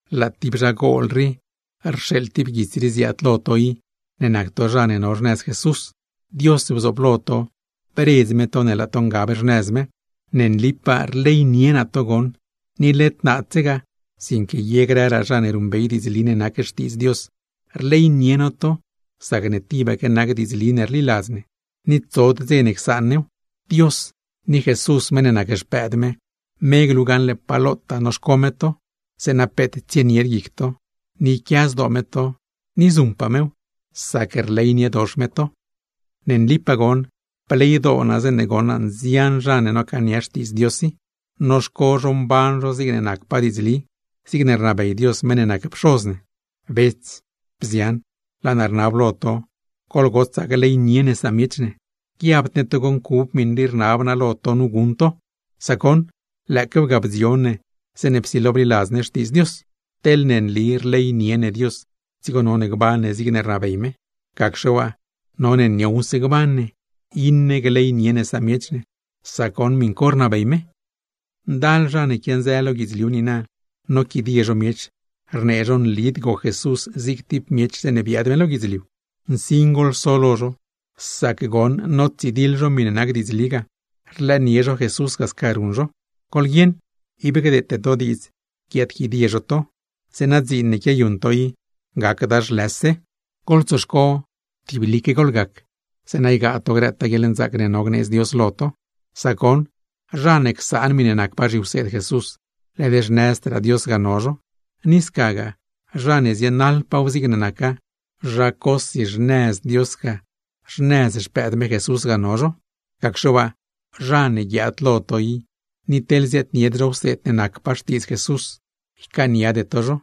Laa tib zhagol rii rxeeḻ tib guits rii ziaad lo to i, ne nac to zha ne no xnëz Jesús. Dios bzooblo to, bredz me to ne laa to ngab xnëz me. Ne nlipaa rleynie naa to goṉ, ni led naadsegaa, sinque ye grëraa zha ne ruṉbey diidzli ne nac Xtiidz Dios. Rleynie no to sacne tibaque nac diidzli ne rliladz ne, ni tsod dze ne csaan new. Dios ni Jesús meṉ ne nac Xpëëd me, me glu gaṉle pa lotaa noxco me to, zeeṉa peet tsienied guic to, ni yquia zdoo me to; ni zuṉpaa mew, sac rleyniedox me to. Ne nlipaa goṉ bleydoo naa zeeṉe goṉ naa nzian zha ne nocaania Xtiidz Dios i, noxco zho mban zho zigne nacpaa diidzli; zigne rnabey Dios meṉ ne nac Pxoz ne. Bets, bzian, laa naa rnab lo to, goḻgotsaa gleynie ne samiech ne. Guiabd ne togo ncub miṉe rne naa lo to nu guṉ to; sac goṉ, lëëquew ga bdzion ne zeeṉe psilo bliladz ne Xtiidz Dios. Teḻne nli rleynie ne Dios, dzigo none gban ne zigne rnabey me; gacxe waa, none niowse gban ne, iṉe gleynie ne samiech ne, sac goṉ miṉ co rnabey me. Ndal zha ne quianzë lo guidzliu niina, noquidie zho miech, rnee zho nlid goc Jesús zig tib miech zeeṉe biaad me lo guidzliu. Nsin goḻso lo zho, sac goṉ notsidiḻ zho miṉe nac diidzli ga, rlëënie zho Jesús ga sca ruṉ zho. Goḻguieṉ, ib gdeete to diidz guiaadquidie zho to, zeeṉa dziin ne quiayuṉ to i gacda zhlëse. Goḻtsoxco tiblique goḻgac, zeeṉa ygaa to grëtaa guieḻnzaac ne no gneedz Dios lo to. Sac goṉ, zha ne csaan miṉe nacpaa zhiwseed Jesús, led xnëzdraa Dios ga no zho; ni scagaa, zha ne zienaḻpaaw zigne naca, zha cosi xnëz Dios ga, xnëz Xpëëd me Jesús ga no zho. Gacxe waa, zha ne guiaad lo to i ni teḻ ziaadnied zho wseed ne nacpaa Xtiidz Jesús, ycaaniade to zho.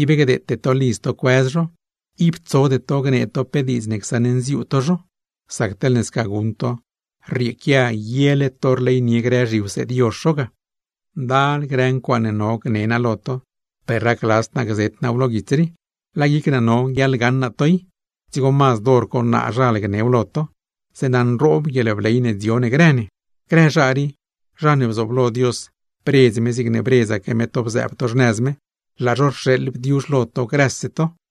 Ib gdeete to lidz to cuëz zho, ib tsode to gnee to pe diidz ne csaṉnziuu to zho; sac teḻne sca guṉ to, rrieequia yele to rleynie grë zhiwseed yozh zho ga. Ndal grë ncuaaṉe no gne naa lo to, per racladzd naa gzet naaw lo guits rii. Laa guic naa no guiaḻgaṉ naa to i, dzigo mazd hor co naazhal gnew lo to; zeeṉa nroob guieḻbley ne dzio ne grë ne. Grë zha rii, zha ne bzooblo Dios bredz me zigne bredzaque me to bzëëb to xnëz me, laa zho rxeeḻ bdiuzh lo to grëse to. Juan